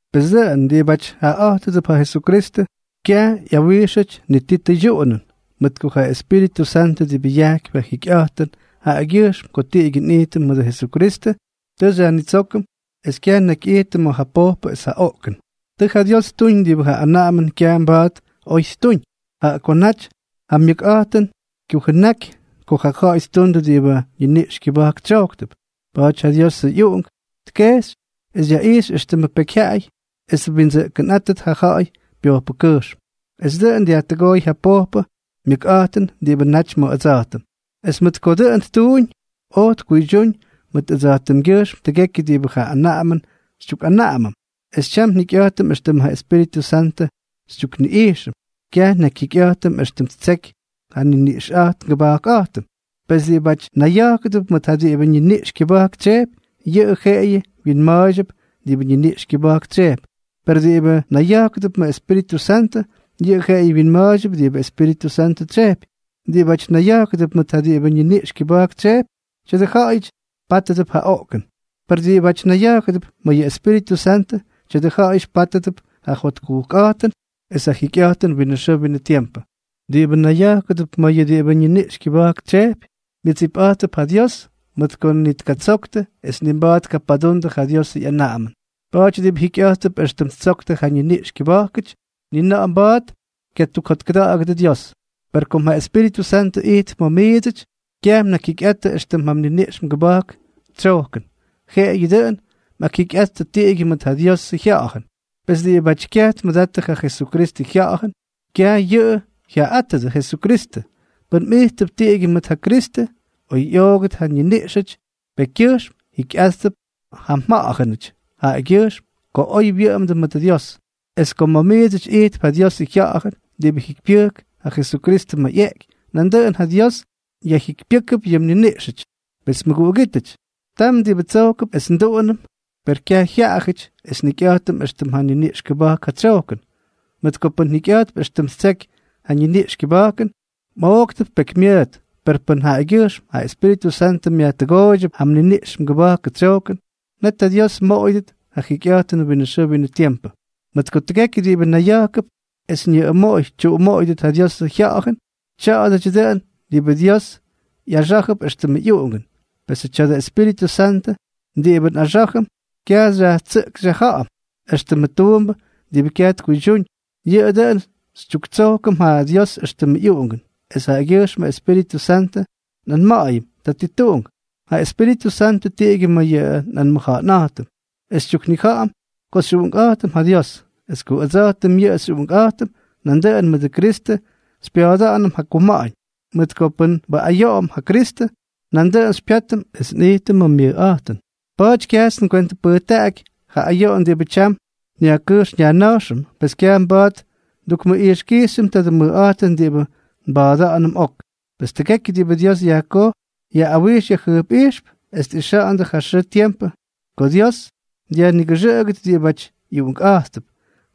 Pes dʉꞌʉn diꞌibáty jaꞌaꞌa̱jtʉdʉp ja Jesukristʉ, kyaj ꞌyawijxʉty ni ti tʉydyuꞌunʉn, mʉt ko ja Espíritʉ Santʉ diꞌibʉ yajkypy ja jikyꞌa̱jtʉn jaꞌagyʉjxm ko tiꞌigyʉ nꞌijtʉm mʉdʉ Jesukristʉ, tʉ xyajnitsókʉm es kyaj nnakyꞌijtʉm ma̱ ja pojpʉ es ja oꞌkʉn. Tʉ ja Dios ttuñ diꞌibʉ ja anaꞌamʉn kyaj mba̱a̱t oj ttuñ, jaꞌa ko naty ja myʉkꞌa̱jtʉn kyujʉnákʉty ko ja ja̱ꞌa̱y ttundʉ diꞌibʉ ñiniꞌx kyʉba̱jk tsyojktʉp. Pa̱a̱ty ja Diosʉ ꞌyUꞌunk tkejxy es yaꞌijxy éxtʉmʉ pekyjyaꞌay es twindsʉꞌkʉnꞌátʉt ja ja̱ꞌa̱y pyojpʉkyʉjxm, es dʉꞌʉn dyajtʉgooy ja pojpʉ myʉkꞌa̱jtʉn diꞌibʉ naty ma̱ ʉdsa̱jtʉm. Es mʉt ko dʉꞌʉn ttuuñ, oj tkuydyúñ mʉt ʉdsa̱jtʉmgyʉjxm tʉgekyʉ diꞌibʉ ja anaꞌamʉn xytyukꞌanaꞌamʉm, es tyam njikyꞌa̱jtʉm éxtʉm ja Espíritʉ Santʉ xytyukniꞌijxʉm, kyaj nnakyjyikyꞌa̱jtʉm éxtʉm ttseky ja nniniꞌxꞌa̱jtʉm ngʉba̱jkꞌa̱jtʉm. Pes diꞌibáty nayya̱jkʉdʉp mʉt ja diꞌibʉ ñiniꞌx kyʉba̱jk tsyejpy, yʉꞌʉ jeꞌeyʉ wyinma̱a̱ydyʉp diꞌibʉ ñiniꞌx kyʉba̱jk tsyejpy; per diꞌibʉ nayya̱jkʉdʉp ma̱ Espíritʉ Santʉ, yʉꞌʉ jeꞌeyʉ wyinma̱a̱ydyʉp diꞌibʉ Espíritʉ Santʉ tsyejpy. Diꞌibáty nayya̱jkʉdʉp mʉt ja diꞌibʉ ñiniꞌx kyʉba̱jk tsyejpy, tya̱dʉ ja̱ꞌa̱yʉty pátʉdʉp ja oꞌkʉn. Per diꞌibáty nayya̱jkʉdʉp ma̱ yʉ Espíritʉ Santʉ, tya̱dʉ ja̱ꞌa̱yʉty pátʉdʉp ja jotkujkꞌa̱jtʉn es ja jikyꞌa̱jtʉn winʉ xʉʉ winʉ tiempʉ. Diꞌibʉ nayya̱jkʉdʉp ma̱ yʉ diꞌibʉ ñiniꞌx kyʉba̱jk tsyejpy, myʉdsipꞌa̱jttʉp ja Dios, mʉt ko ni tkatsoktʉ es ni mba̱a̱t tkapadundʉ ja Diosʉ ꞌyanaꞌamʉn. Pa̱a̱ty diꞌibʉ jikyꞌa̱jttʉp éxtʉm ttsoktʉ ja ñiniꞌx kyʉba̱jkʉty, ni na̱ꞌa̱ mba̱a̱t kyatukjotkʉda̱ꞌa̱gʉdʉ Dios. Per kom ja Espíritʉ Santʉ ijtp ma̱ miidsʉty, kyaj mnakyjyikyꞌattʉ éxtʉm ja mniniꞌx mgʉba̱jkʉ tsyojkʉn, jeꞌeyʉ dʉꞌʉn mꞌakjikyꞌattʉ tiꞌigyʉ mʉt ja Diosʉ Jya̱ꞌa̱jʉn. Pes diꞌibáty kyaj tmʉdattʉ ja Jesukristʉ Jya̱ꞌa̱jʉn, kyaj yʉꞌʉ jyaꞌaꞌátʉdʉ Jesukristʉ. Pʉn mꞌijttʉp tiꞌigyʉ mʉt ja Kristʉ, oy ꞌyoogʉt ja mniniꞌxʉty pekykyʉjxm, jikyꞌa̱jttʉp ja mja̱ꞌa̱jʉnʉty jaꞌagyʉjxm ko oy mwʉꞌʉmdʉ mʉt ja Dios. Es kom ma̱ miidsʉty ijtp ja Diosʉ Jya̱ꞌa̱jʉn diꞌibʉ yajjikypyʉjk ja Jesukristʉ ma̱ ꞌyeꞌky, nandʉꞌʉn ja Dios yajjikypyʉ́kʉp yʉ mniniꞌxʉty. Pes mʉguꞌugítʉty, tam diꞌibʉ tsojkʉp es nduꞌunʉm, per kyaj jyaꞌajʉty es njikyꞌa̱jtʉm éxtʉm ja niniꞌx kʉba̱jk ja tsyojkʉn. Mʉt ko pʉn mjikyꞌa̱jttʉp éxtʉm ttseky ja niniꞌx kʉba̱jkʉn, mꞌooktʉp pekymyʉʉt; per pʉn jaꞌagyʉjxm ja Espíritʉ Santʉ myajtʉgooydyʉp ja mniniꞌx mgʉba̱jkʉ tsyojkʉn, net ja Dios mmoꞌoyʉdʉt ja jikyꞌa̱jtʉnʉ winʉ xʉʉ winʉ tiempʉ. Mʉt ko nidʉgekyʉ diꞌibʉ nayya̱jkʉdʉp es ñʉꞌʉmoꞌoy tyuꞌumoꞌoyʉdʉt ja Diosʉ Jya̱ꞌa̱jʉn, tya̱a̱dʉdyʉ dʉꞌʉn diꞌibʉ Dios ꞌyaxá̱jʉp éxtʉmʉ ꞌyuꞌungʉn. Pesʉ tya̱dʉ Espíritʉ Santʉ diꞌibʉ nꞌaxá̱jʉm, kyaj xyajtsʉꞌk xyajja̱ꞌa̱m éxtʉmʉ tuumbʉ diꞌibʉ kyaj tkuydyúñ, yʉꞌʉ dʉꞌʉn xytyuktsojkʉm ja Dios éxtʉmʉ ꞌyuꞌungʉn. Es jaꞌagyʉjxmʉ Espíritʉ Santʉ nꞌanma̱ꞌa̱yʉm: “Tatituꞌunk.” Ja Espíritʉ Santʉ tyiꞌigyʉ ma̱ yʉ nꞌanmʉja̱ꞌa̱nꞌa̱jtʉm, es xytyuknija̱ꞌa̱m ko xyꞌuꞌunkꞌa̱jtʉm ja Dios. Es ko ʉdsa̱jtʉm yʉꞌʉ xyꞌuꞌunkꞌa̱jtʉm, nandʉꞌʉn mʉdʉ Kristʉ xypya̱a̱da̱ꞌa̱nʉm ja kuma̱ꞌa̱ñ; mʉt ko pʉn nbuꞌayoꞌom ja Kristʉ, nandʉꞌʉn xypyátʉm es nꞌijtʉm ma̱ myʉjꞌa̱jtʉn. Pa̱a̱ty kyajts ngwentʉpʉjtaꞌaky ja ayoꞌon diꞌibʉ tyam nyajkʉjx nyajna̱jxʉm. Pes kyaj mba̱a̱t ndukmʉꞌijxkijxyʉm tadʉ mʉjꞌa̱jtʉn diꞌibʉ nba̱a̱da̱ꞌa̱nʉm ok. Pes tʉgekyʉ diꞌibʉ Dios yajkoj ꞌyawijx jyʉjpꞌijxtʉp es tꞌixa̱ꞌa̱ndʉ ja xʉʉ tiempʉ ko Dios dyajnigʉxʉꞌʉgʉt diꞌibáty ꞌyuꞌunkꞌa̱jttʉp.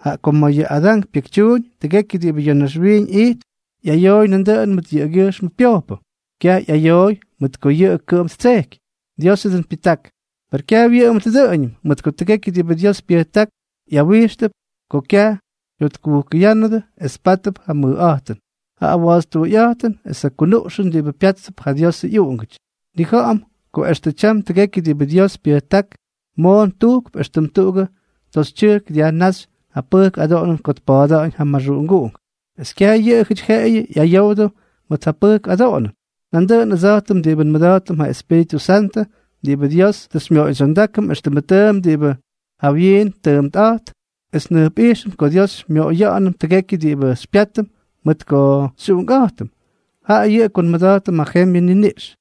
Jaꞌa ko ma̱ ja Adán pyekytyuuñ, tʉgekyʉ diꞌibʉ ya̱ naxwiiñ ijtp ꞌyayoy nandʉꞌʉn mʉt jaꞌagyʉjxmʉ pyojpʉ; kyaj ꞌyayoy mʉt ko yʉꞌʉ kʉꞌʉm ttsejky, Diosʉ dʉꞌʉn pyʉjták. Per kyaj wyʉꞌʉmʉt dʉꞌʉñʉm, mʉt ko tʉgekyʉ diꞌibʉ Dios pyʉjták ꞌyawijxtʉp ko kyaj ꞌyokkutʉgoyánnʉdʉ es pátʉp ja mʉjꞌa̱jtʉn, ja awa̱ꞌa̱tstuuyꞌa̱jtʉn es ja kunuꞌxʉn diꞌibʉ pya̱a̱ttʉp ja Diosʉ ꞌyuꞌungʉty. Nnija̱ꞌa̱m ko extʉ tyam tʉgekyʉ diꞌibʉ Dios pyʉjták moon tujkp éxtʉm tuꞌugʉ toxytyʉjk dyajnáxy ja pʉjk adoꞌonʉn ko tpa̱a̱da̱ꞌa̱ñ ja maxuꞌunguꞌunk. Es kyaj yʉꞌʉjʉty jeꞌeyʉ ꞌyayowdʉ mʉt ja pʉjk adoꞌonʉn, nandʉꞌʉn ʉdsa̱jtʉm diꞌibʉ nmʉda̱jtʉm ja Espíritʉ Santʉ diꞌibʉ Dios tʉ xymyoꞌoydsyondákʉm éxtʉmʉ tʉʉmp diꞌibʉ jawyiin tʉʉmpꞌa̱jtp, es njʉjpꞌijxʉm ko Dios xymyoꞌoyʉm tʉgekyʉ diꞌibʉ xypyátʉm mʉt ko xyꞌuꞌunkꞌa̱jtʉm, jaꞌa yʉꞌʉ ko nmʉda̱jtʉm ja jembyʉ niniꞌx.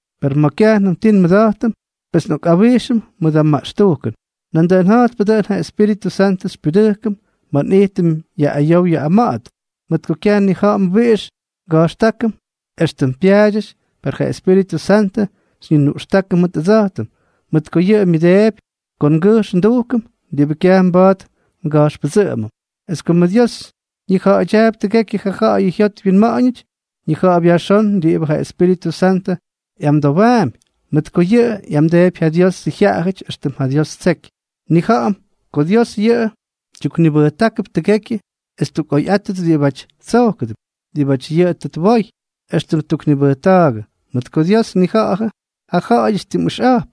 Per ma̱ kyajnʉm ti nmʉda̱jtʉm, pes nꞌokꞌawijxʉm mʉdʉ maꞌxtujkʉn. Nandʉꞌʉn ja̱jtpʉ dʉꞌʉn, ja Espíritʉ Santʉ xypyudʉjkʉm ma̱ nꞌijtʉm yaꞌꞌayow yaꞌꞌama̱ꞌa̱t, mʉt ko kyaj nnija̱ꞌa̱m wiꞌix nga̱jxtákʉm éxtʉm pyaadyʉty, per ja Espíritʉ Santʉ xyñinuꞌxtákʉm mʉt ʉdsa̱jtʉm, mʉt ko yʉꞌʉ myʉdeepy ko ngʉjx ndujkʉm diꞌibʉ kyaj mba̱a̱t nga̱jxpʉdsʉꞌʉmʉm. Es komʉ Dios ñija̱ꞌa̱dyaapy tʉgekyʉ ja ja̱ꞌa̱y jyot wyinma̱ꞌa̱ñʉty, ñija̱ꞌa̱p yajxón diꞌibʉ ja Espíritʉ Santʉ ꞌyamdowaampy, mʉt ko yʉꞌʉ ꞌyamdeepy ja Diosʉ jyaꞌayʉty éxtʉm ja Dios ttseky. Nnija̱ꞌa̱m ko Dios yʉꞌʉ tyuknibʉjtákʉp tʉgekyʉ es ttukꞌoyꞌáttʉt diꞌibáty tsojkʉdʉp, diꞌibáty yʉꞌʉ tʉ twoy, éxtʉm tʉ ttuknibʉjta̱a̱gʉ. Mʉt ko Dios tnija̱ꞌa̱jʉ ja jyaꞌay tim ʉxꞌa̱jp,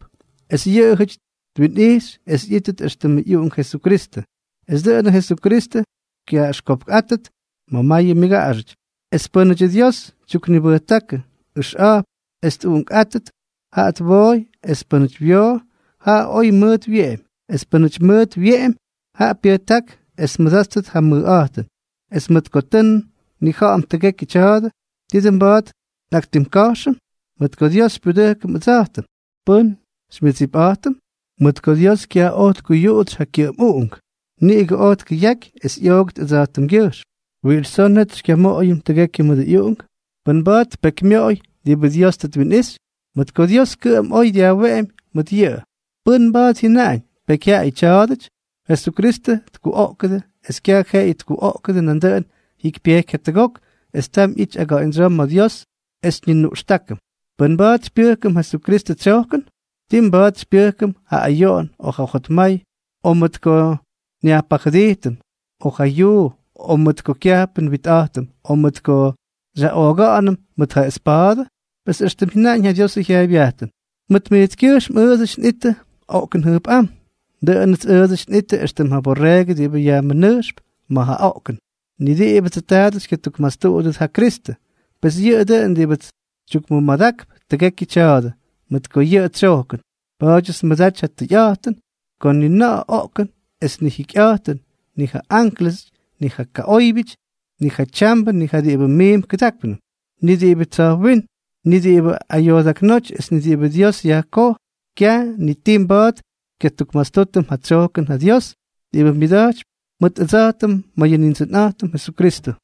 es yʉꞌʉjʉty twinꞌijxy es ꞌyítʉt éxtʉmʉ ꞌyUꞌunk Jesukristʉ, es dʉꞌʉnʉ Jesukristʉ kyaꞌaxkopkꞌátʉt ma̱ mayʉ myʉgaꞌaxʉty. Es pʉ́nʉdyʉ Dios tyuknibʉjtákʉ ʉxꞌa̱jp es tꞌuꞌunkꞌáttʉt, jaꞌa twooy; es pʉ́nʉty wyoo, jaꞌa oy mʉʉt wyeꞌemy; es pʉ́nʉty oy mʉʉt wyeꞌemy, jaꞌa pyʉjták es tmʉdáttʉt ja mʉjꞌa̱jtʉn. Es mʉt ko tʉ nnija̱ꞌa̱m tʉgekyʉ tya̱a̱dʉ, ¿ti dʉn mba̱a̱t nꞌaktimka̱jxʉm? Mʉt ko Dios xypyudʉjkʉm ʉdsa̱jtʉm, ¿pʉ́n xymyʉdsipꞌa̱jtʉm? Mʉt ko Dios kyaj oj tkuyuꞌutsy ja kyʉꞌʉm Uꞌunk, niꞌigʉ oj tkʉyaky es ꞌyoogʉt ʉdsa̱jtʉmgyʉjxm, ¿wiꞌix tsoo net xykyamoꞌoyʉm tʉgekyʉ mʉdʉ ꞌyUꞌunk? ¿Pʉ́n mba̱a̱t tpekymyoꞌoy diꞌibʉ Dios tʉ twinꞌixy?, mʉt ko Dios kʉꞌʉm oy dyajweꞌemy mʉt yʉꞌʉ. ¿Pʉ́n mba̱a̱t jyʉnaꞌañ: “Pekyjyaꞌayʉ tya̱a̱dʉty?” Jesukristʉ kuꞌoꞌkʉdʉ, es kyaj jeꞌeyʉ kyuꞌoꞌkʉdʉ, nandʉꞌʉn jyikypyejky jatʉgok es tam ꞌyity aga̱ꞌa̱ñdsyoo ma̱ Dios es xyñinuꞌxtákʉm. ¿Pʉ́n mba̱a̱t xypyʉjkʉm ja Kristʉ tsyojkʉn? ¿Tii mba̱a̱t xypyʉjkʉm ja ayoꞌon, o ja jotmay, o mʉt ko nyajpajʉdijtʉm, o ja yuu, o mʉt ko kyajpʉ nwitꞌa̱jtʉm, o mʉt ko xyaꞌooga̱ꞌa̱nʉm mʉt ja espa̱a̱dʉ? Pes éxtʉm jyʉnaꞌañ ja Diosʉ jyaaybyajtʉn: Mʉt mijtskyʉjxm ʉʉdsʉty nꞌittʉ oꞌkʉn jʉjpꞌám; dʉꞌʉnʉts ʉʉdsʉty nꞌittʉ éxtʉm ja borreegʉ diꞌibʉ yajmʉnʉjxtʉp ma̱ ja oꞌkʉn. Ni diꞌibʉdsʉ taadʉ xykyatukmastuꞌudʉt ja Kristʉ. Pes yʉꞌʉ dʉꞌʉn diꞌibʉts xytyukmʉmadakp tʉgekyʉ tya̱a̱dʉ, mʉt ko yʉꞌʉ xytsyojkʉm. Pa̱a̱dyʉts nmʉdaty ja tʉyꞌa̱jtʉn ko ni ja oꞌkʉn es ni ja jikyꞌa̱jtʉn, ni ja ánklʉsʉty, ni ja kaꞌóybyʉty, ni ja tyambʉ, ni ja diꞌibʉ miimp kʉdákpnʉm, ni diꞌibʉ tsa̱jwínm, ni diꞌibʉ ayoodaknóty es ni diꞌibʉ Dios yajkoj, kyaj ni ti mba̱a̱t xykyatukmastútʉm ja tsyojkʉn ja Dios diꞌibʉ myʉda̱jtypy mʉt ʉdsa̱jtʉm ma̱ yʉ Nindsʉnꞌa̱jtʉm Jesukristʉ.